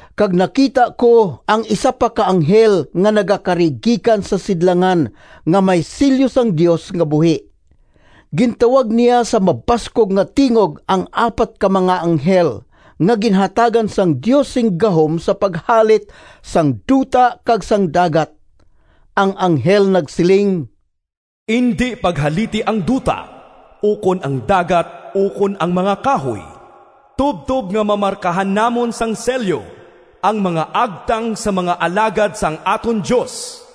Kag nakita ko ang isa pa ka anghel nga nagakari gikan sa sidlangan nga may selyo sang Dios nga buhi. Gintawag niya sa mabaskog nga tingog ang apat ka mga anghel nga ginhatagan sang Dios sing gahom sa paghalit sang duta kag sang dagat. Ang anghel nagsiling, “Indi paghaliti ang duta, ukon ang dagat ukon ang mga kahoy, tubtob nga mamarkahan namon sang selyo ang mga agtang sang mga alagad sang aton Dios.”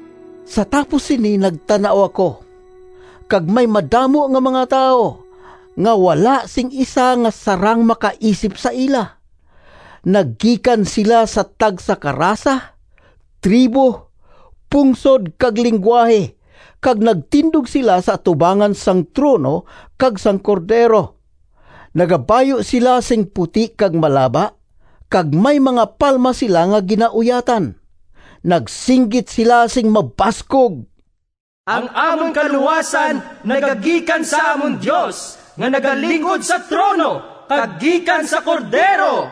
Sa tapos sini nagtan-aw ako, kag may madamo nga mga tawo, nga wala sing isa nga sarang makaisip sa ila. Nagikan sila sa tagsa ka rasa, tribo, pungsod, kag linggwahe, kag nagtindog sila sa atubangan sang trono kag sang Cordero. Nagabayu sila sing puti kag malaba, kag may mga palma sila nga ginauyatan. Nagsinggit sila sing mabaskog, “Ang amon kaluwasan nagagikan sa amon Dios, nga nagalingkod sa trono, kag gikan sa Cordero!”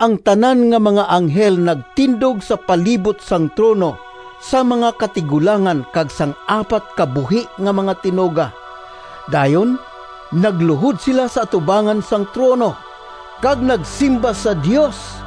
Ang tanan nga mga anghel nagtindog sa palibot sang trono, sang mga katigulangan kag sang apat ka buhi nga mga tinuga. Dayon nagluhod sila sa atubangan sang trono, kag nagsimba sa Dios,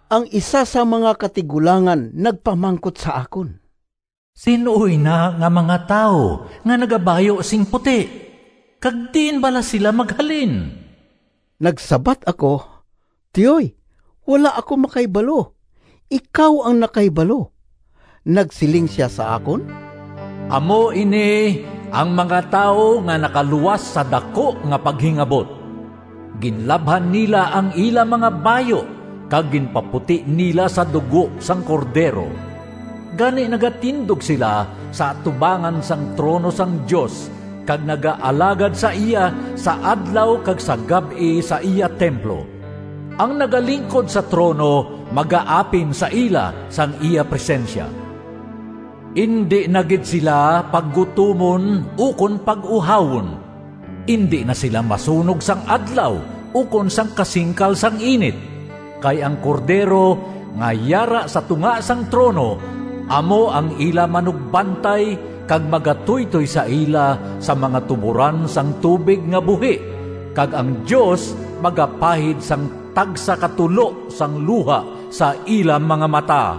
Ang isa sang mga katigulangan nagpamangkot sa akon, “Sin-o ina nga mga tawo nga nagabayu sing puti, kag diin bala sila maghalin?” Nagsabat ako, “Tiyoy, wala ako makahibalo. Ikaw ang nakahibalo.” Nagsiling sia sa akon, “Amo ini ang mga tawo nga nakaluwas sa daku nga paghingabot. Ginlabhan nila ang ila mga bayu kag ginpaputi nila sa dugo sang Cordero. Gani nagatindog sila sa atubangan sang trono sang Dios kag nagaalagad sa iya sa adlaw kag sa gab-i sa iya templo. Ang nagalingkod sa trono magaapin sa ila sang iya presensya. Indi na gid sila paggutomon ukon pag-uhawon. Indi na sila masunog sang adlaw ukon sang kasingkal sang init. Kay ang Cordero, nga yara sa tunga sang trono, amo ang ila manugbantay, kag magatuytoy sa ila sa mga tuboran sang tubig nga buhi, kag ang Dios magapahid sang tagsa ka tulo sang luha sa ila mga mata.”